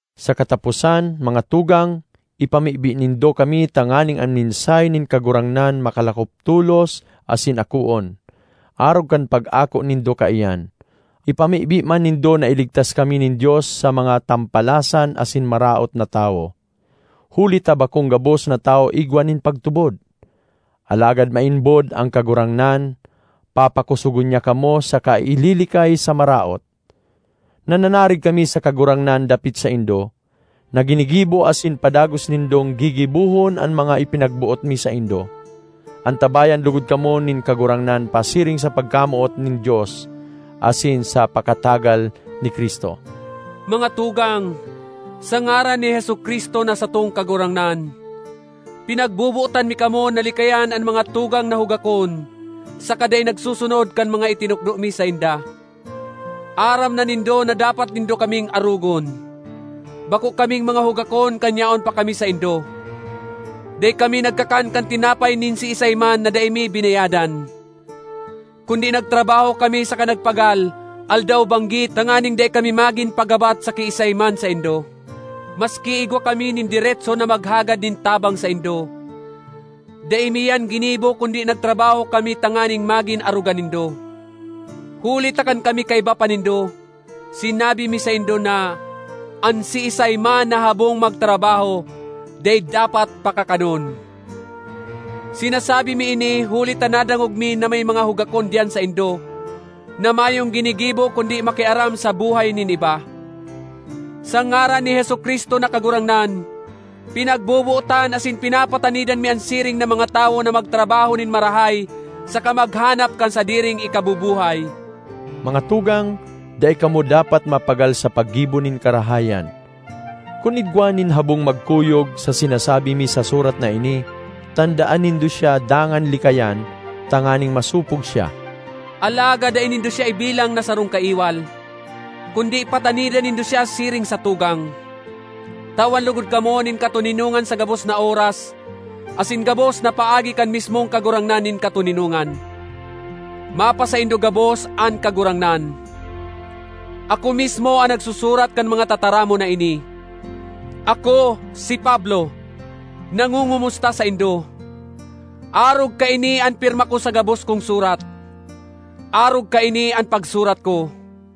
Sa kataposan, mga tugang, ipamibi nindo kami tanganing an mensahe nin Kagurangnan makalakop tolos asin akoon, arog kan pag-ako nindo kaiyan. Ipamibi man nindo na iligtas kami nin Dios sa mga tampalasan asin maraot na tawo, huli ta bakong gabos na tawo igwa nin pagtubod. Alagad maimbod an Kagurangnan. Papakosogon niya kamo saka ililikay sa Maraot. Nananarig kami sa Kagurangnan dapit saindo, na ginigibo asin padagos nindong gigibohon an mga ipinagboot mi saindo. Antabayan logod kamo nin Kagurangnan pasiring sa pagkamoot nin Dios asin sa pakatagal ni Cristo. Mga tugang, sa ngaran ni Jesu-Cristo na satong Kagurangnan, pinagbobotan mi kamo na likayan an mga tugang na hugakon saka dai nagsusunod kan mga itinukdo mi sainda. Aram na nindo na dapat nindo kaming arogon. Bako kaming mga hugakon kan yaon pa kami saindo. Dai kami nagkakan kan tinapay nin siisay man na dai mi binayadan, kundi nagtrabaho kami saka nagpagal aldaw-banggi tanganing dai kami magin pagabat sa kiisay man saindo. Maski igwa kami nin deretso na maghagad nin tabang saindo, dai mi iyan ginibo kundi nagtrabaho kami tanganing magin arogan nindo. Huli ta kan kami kaiba pa nindo, sinabi mi saindo na, “An siisay man na habong magtrabaho, dai dapat pakakanon.” Sinasabi mi ini huli ta nadangog mi na may mga hugakon diyan saindo na mayong ginigibo kundi makiaram sa buhay nin iba. Sa ngaran ni Jesu-Cristo na Kagurangnan, pinagbobotan asin pinapatanidan mi an siring na mga tawo na magtrabaho nin marahay saka maghanap kan sadiring ikabubuhay. Mga tugang, dai kamo dapat mapagal sa paggibo nin karahayan. Kun igwa nin habong magkuyog sa sinasabi mi sa surat na ini, tandaan nindo siya dangan likayan tanganing masopog siya. Alagad dai nindo siya ibilang na sarong kaiwal, kundi patanidan nindo siya siring sa tugang. Tawan logod kamo nin katoninongan sa gabos na oras asin gabos na paagi kan mismong Kagurangnan nin katoninongan. Mapasaindo gabos an Kagurangnan. Ako mismo an nagsusurat kan mga tataramon na ini: Ako, si Pablo, nangongomusta saindo. Arog kaini an pirma ko sa gabos kong surat. Arog kaini an pagsurat ko.